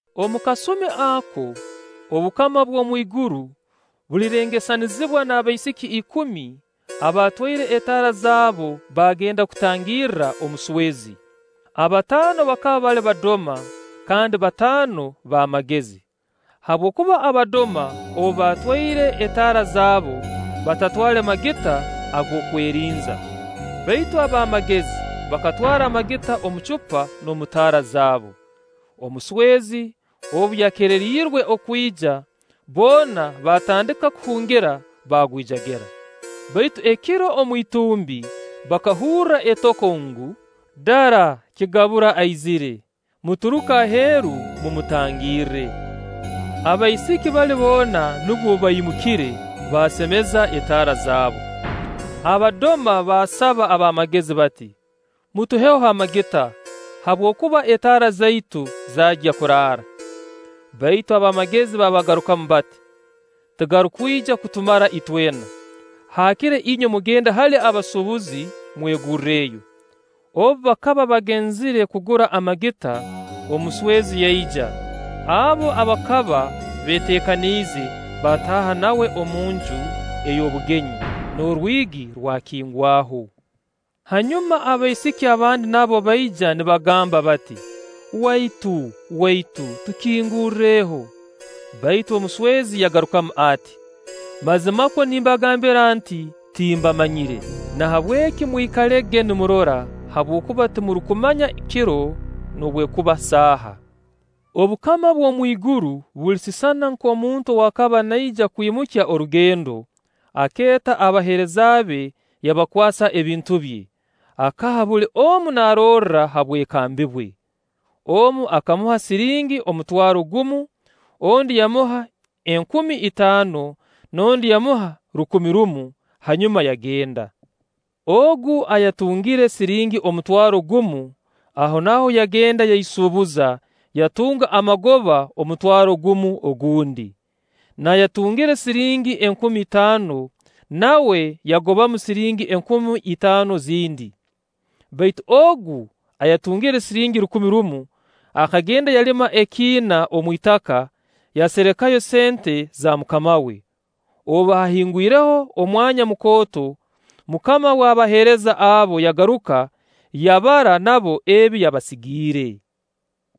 “Omu kasumi ako, obukama bw'omwiguru bulirengesanizibwa n'abaisiki ikumi abatwaire etaara zaabo baagenda kutangirra omuswezi. Abataano bakaba bali badoma, kandi bataano b'amagezi. Habwokuba abadoma obu baatwaire etaara zaabo, batatwale magita ag'okwerinza; baitu ab'amagezi bakatwara amagita omu cupa n'omu taara zaabu. Omuswezi obu yakeererirwe okwija, boona baatandika kuhungira, baagwijagira. “Baitu ekiro omu itumbi bakahurra etoko ngu: ‘Dara kigabura aizire! Muturuke aheeru mumutangirre.’ Abaisiki bali boona nubwo baimukire, baasemeza etaara zaabo. Abadoma baasaba ab'amagezi bati: ‘Mutuheho amagita, habwokuba etaara zaitu zaagya kuraara.’ Baitu ab'amagezi baabagarukamu bati: ‘Tigarukwija kutumara itwena; haakire inywe mugende hali abasuubuzi mwegurreyo.’ Obu bakaba bagenzire kugura amagita, omuswazi yaija; abo abakaba beeteekaniize baataaha nawe omu nju ey'obugenyi, n'orwigi rwakingwaho. Hanyuma abaisiki abandi nabo baija nibagamba bati: ‘Waitu, waitu, tukingurreho!’ Baitu omuswezi yagarukamu ati: ‘Mazimakwo nimbagambira nti: Timbamanyire.’ Nahabweki mwikalege nimurora, habwokuba timurukumanya kiro noobwekuba saaha.” “Obukama bw'omwiguru bulisisana nk'omuntu ow'akaba naija kwimukya orugendo; akeeta abaheereza be yabakwasa ebintu bye. Akaha buli omu narorra ha bwekambi bwe. Omu akamuha siringi omutwaro, gumu, ondi yamuha enkumi itaano, n'ondi yamuha rukumi rumu, hanyuma yagenda. Ogu ayatungire siringi omutwaro gumu, ahonaaho yagenda yaisuubuza; yatunga amagoba omutwaro gumu ogundi. N'ayatungire siringi enkumi itaano, nawe yagobamu siringi enkumi itaano zindi. Baitu ogu ayatungire siringi rukumi rumu, akagenda yalima ekiina omu itaka, yaserekayo sente za mukama we. “Obu haahingwireho omwanya mukooto, mukama w'abaheereza abo yagaruka, yabara nabo ebi yabasigiire.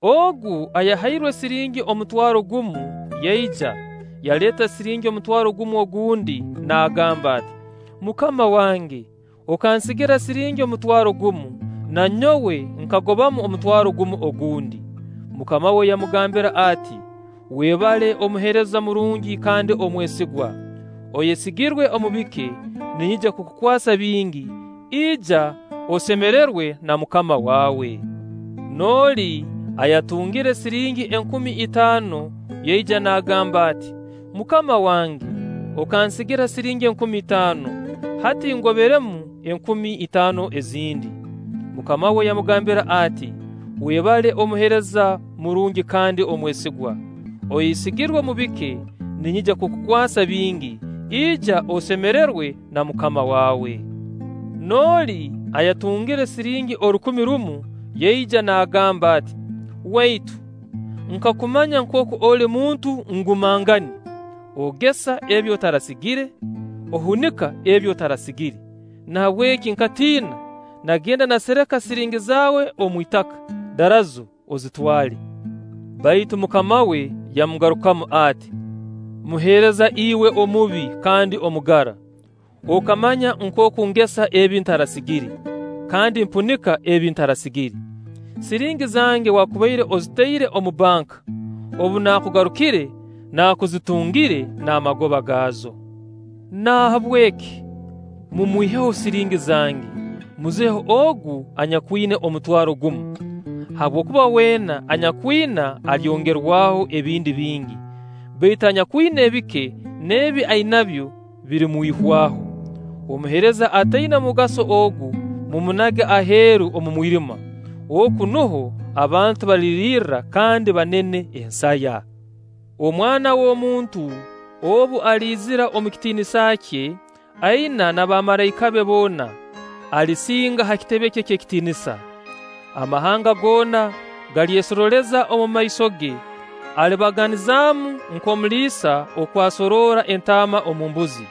Ogu ayahairwe siringi omutwaro gumu yaija, yaleeta siringi omutwaro gumu ogundi naagamba ati: ‘Mukama wange okansigira siringi omutwaro gumu, na nyowe nkagobamu omutwaro gumu ogundi.’ Mukama we yamugambira ati: ‘Webale omuheereza murungi kandi omwesigwa; oyesigirwe omu bike, ninyija kukukwasa bingi; ija osemererwe na mukama waawe.’ N'oli ayatungire siringi enkumi itaano yaija, naagamba ati: ‘Mukama wange, okansigira siringi enkumi itaano, hati ngoberemu enkumi itaano ezindi.’ Mukama we yamugambira ati: ‘Webale omuheereza murungi kandi omwesigwa; oyesigirwe omu bike, ninyija kukukwasa bingi; ija osemererwe na mukama waawe.’ N'oli ayatungire siringi orukumi rumu yaija naagamba ati: ‘Waitu, nkakumanya nkooku oli muntu ngumangani. Ogesa ebi otarasigire, ohunika ebi otarasigire; nahabweki nkatiina, naagenda naasereka siringi zaawe omu itaka. Darazo, ozitwale.’ Baitu mukama we yamugarukamu ati: ‘Muheereza iwe omubi kandi omugara! Okamanya nkooku ngesa ebi ntarasasigire, kandi mpunika ebi ntarasigire. Siringi zange waakubaire ozitaire omu banka, obu naakugarukire naakuzitungire n'amagoba gaazo. Nahabweki mumwiheho siringi zange, muzihe ogu anyakwina omutwaro gumu. Habwokuba weena anyakwina alyongerwaho ebindi bingi; baitu anyakwina ebike, n'ebi ainabyo birimwihwaho. Omuheereza ataina mugaso ogu, mumunage aheeru omu mwirima. Oku nuho abantu baliririrra, kandi banene ensaya.’” “Omwana w'omuntu obu aliizira omu kitiinisa kye aina n'abamalaika be boona, alisinga ha kitebe kye eky'ekitiinisa. Amahanga goona galyesorooleza omumaiso ge, alibabaganizaamu nk'omuliisa okw'asoroora entaama omu mbuzi.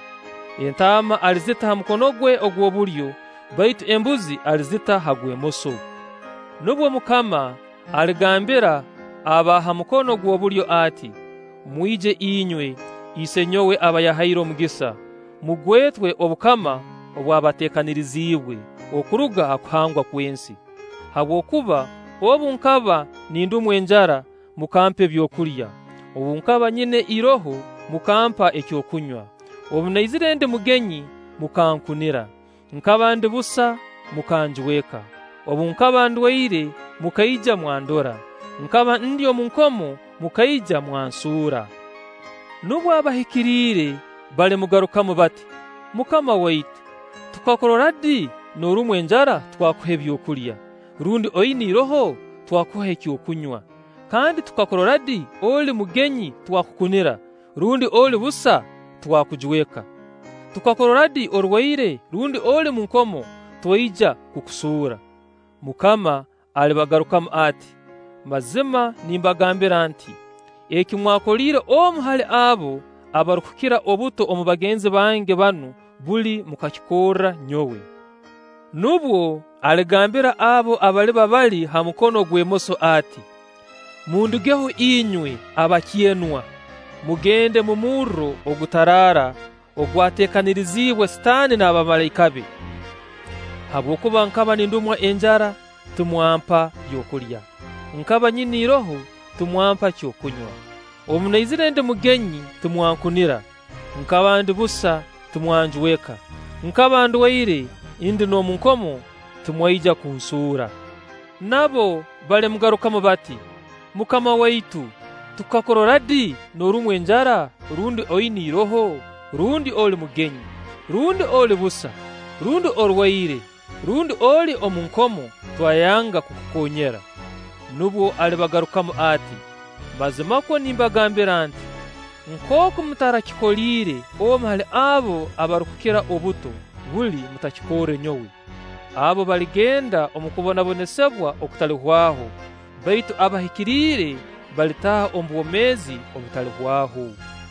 Entaama alizita ha mukono gwe ogw'obulyo, baitu embuzi alizita ha gw'emoso. Nubwo Mukama aligambira aba ha mukono gw'obulyo ati: ‘Mwije inywe Isenyowe aba yahaire omugisa, mugwetwe obukama obwabateekaniriziibwe okuruga ha kuhangwa kw'ensi; habwokuba obu nkaba nindumwa enjara, mukampa ebyokulya; obu nkaba nyina iroho, mukampa ekyokunywa; obu naizire ndi mugenyi mukankunira; nkaba ndi busa, mukanjweka; obu nkaba ndwaire, mukaija mwandora; nkaba ndi omu nkomo, mukaija mwansuura.’ Nubwo abahikiriire balimugarukamu bati: ‘MUKAMA waitu, tukakurora di norumwa enjara, twakuha ebyokulya; rundi oina iroho, twakuha ekyokunywa? Kandi tukakurora di oli mugenyi twakukunira; rundi oli busa, twakujweka? Tukakurora di orwaire, rundi oli mu nkomo, twaija kukusuura?’ Mukama alibagarukamu ati: ‘Mazima nimbagambira nti: Eki mwakoliire omu hali abo abarukukira obuto omu bagenzi bange banu, buli mukakikorra nyowe.’ “Nubwo aligambira abo abaliba bali ha mukono ogw'emoso ati: ‘Mundugeho inywe abakyenwa, mugende omu murro ogutaraara ogwateekaniriziibwe Sitaani n'abamalaika be; habwokuba nkaba nindumwa enjara, timwampa byokulya; nkaba nyina iroho, timwampa kyokunywa; obunaizire ndi mugenyi, timwankunira; nkaba ndi busa, timwanjweka; nkaba ndwaire, ndi n'omu nkomo, timwaija kunsuura.’ Nabo balimugarukamu bati: ‘MUKAMA waitu, tukakurora di norumwa enjara, rundi oina iroho, rundi oli mugenyi, rundi oli busa, rundi orwaire, rundi oli omu nkomo, twayanga kukukoonyera?’ Nubwo alibagarukamu ati: ‘Mazimakwo nimbagambira nti: Nkooku mutarakikoliire omu hali abo abarukukira obuto, buli mutakikorre nyowe.’ Abo baligenda omu kubonabonesibwa okutalihwaho, baitu abahikiriire balitaaha omu bwomeezi obutalihwaho.”